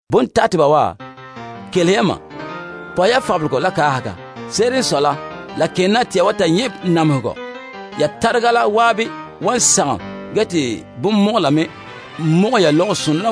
Bontateba wa, kelehe ya. Pɔhɛ ya fabelegɔ la kaahega. Se'ere n sɔe la, la ken na te ya wan ta nyɛ' namehegɔ. Ya tarega la zan'an wan sagom ge te bonmɔgɔla me mɔgɛ ya fusonɔ la.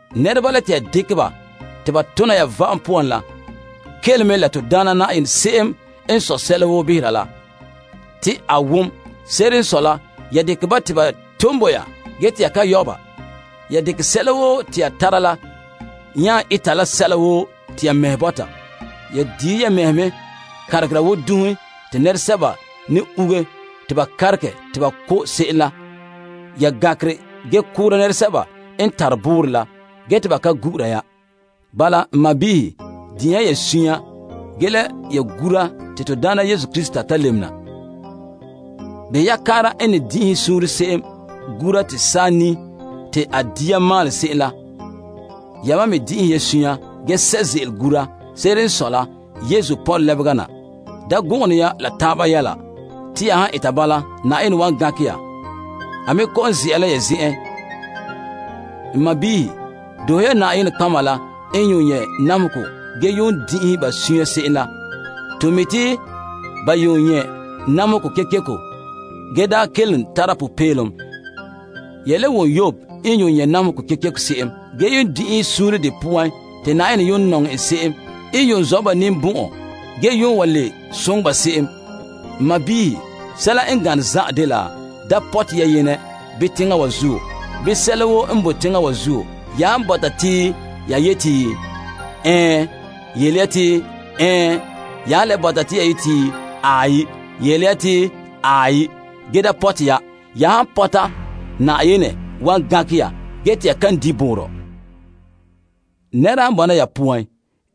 Nɛreba la te ya dekɛ ba te ba tona ya va'am poan la, kele mɛ. La to Daana Na'ayenɛ se'em n sɔe sɛla woo behera la, te a wom. Se'ere n sɔe la, ya dekɛ ba te ba ton bo ya ge te ya ka yɔ' ba. Ya dekɛ sɛla woo te ya tara la nya eta la sɛla woo te ya mɛhe bɔta. Ya diihe ya mɛhe kanregera wo dunhe te nɛresɛba ne uuge te ba kanregɛ te ba ko' se'em la. Ya gankere ge koora nɛresɛba n tare boorɔ la, ge te ba ka gu'ura ya. Bala, n sɔɔnrɔ, din'inhe ya suunre ge la ya gura te to Daana Yesu Krista ta lebena. Behɛ ya kaara n ne din'inhe suunre se'em gura te saa nii te a dia maalɛ se'em la. Yamam me din'inhe ya suunre ge sɛ' ze'ele gura. Se'ere n sɔe la, Yesu pɔnre lebega na. Da gɔngene ya la taaba yɛla. Ya han eta bala, Na'ayenɛ wan gankɛ ya. A me kɔ'ɔn ze'a la ya zen'en. N sɔɔnrɔ, doohe ya nɔtɔgɔheba la n yuun nyɛ' namehegɔ ge yuun din'inhe ba suunre se'em la. To mi' te ba yuun nyɛ' namehegɔ kekeko ge daa kelom tara popeelom. Ya le wom Yob n yuun nyɛ' namehegɔ kekeko se'em, ge yuun din'inhe suunre de poan. Te Na'ayenɛ yuun nɔŋɛ ba se'em la n yuun zɔ' ba ninbɔn'ɔn ge yuun le soŋɛ ba se'em. N sɔɔnrɔ, sɛla n gane zan'an dena. Da pɔte ya Yenɛ bii teŋa wa zuo, bii sɛla woo n boe teŋa wa zuo. Ya han bɔta te ya yeti, Ɛɛn, yele ya te Ɛɛn, ge ya han le bɔta te ya yeti, Aai, yele ya te Aai, ge da pɔte ya. Ya han pɔta, Na'ayenɛ wan gankɛ ya ge te ya kan di' boorɔ. Nɛra han bɔna ya poan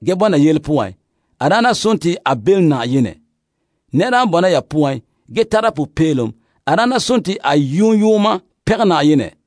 ge bɔna yele poan, a daana sontii a belom Na'ayenɛ. Nɛra han bɔna ya poan ge tara popeelom, a daana sontii a yoon yooma pɛngɛ Na'ayenɛ.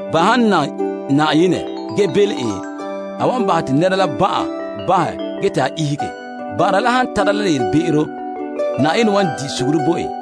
Ba han nam Na'ayenɛ ge belom en, a wan bahɛ te nɛra la ban'an bahɛ ge te a ihege. Ban'ara la han tara la be'em, Na'ayenɛ wan di' suguru bo en.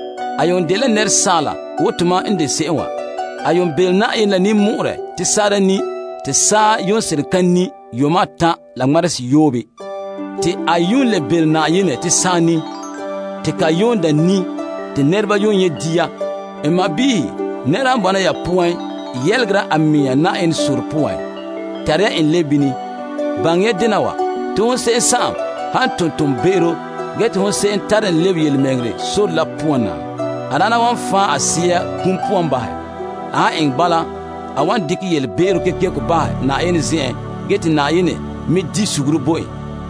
Eliya yuun dela asaala wo tomam n de se'em wa. A yuun sohe Na'ayenɛ la ninmɔ'ɔrɛ te saa ka ni, te saa yuun seren ka ni yuuma atan' la ŋmarehe seyoobe. Te a yuun le sohe Na'ayenɛ te saa ni, te ka yuun daa ni, te nɛreba yuun nyɛ' dia. N sɔɔnrɔ, nɛra han bɔna ya poan yelegera a mɛŋa Na'ayenɛ sore poan, tare ya en lebe bini. Baŋɛ ya dena wa: hon se'em han ton toonbe'ero ge te hon se'em tare en lebe yelemɛŋɛrɛ sore la poan na, a daana wan fan' a sea kum poan bahɛ. A han eŋɛ bala, a wan bahɛ te Na'ayenɛ dekɛ a yelebe'ero kekeko bahɛ, ge Na'ayenɛ wan di' suguru bo en.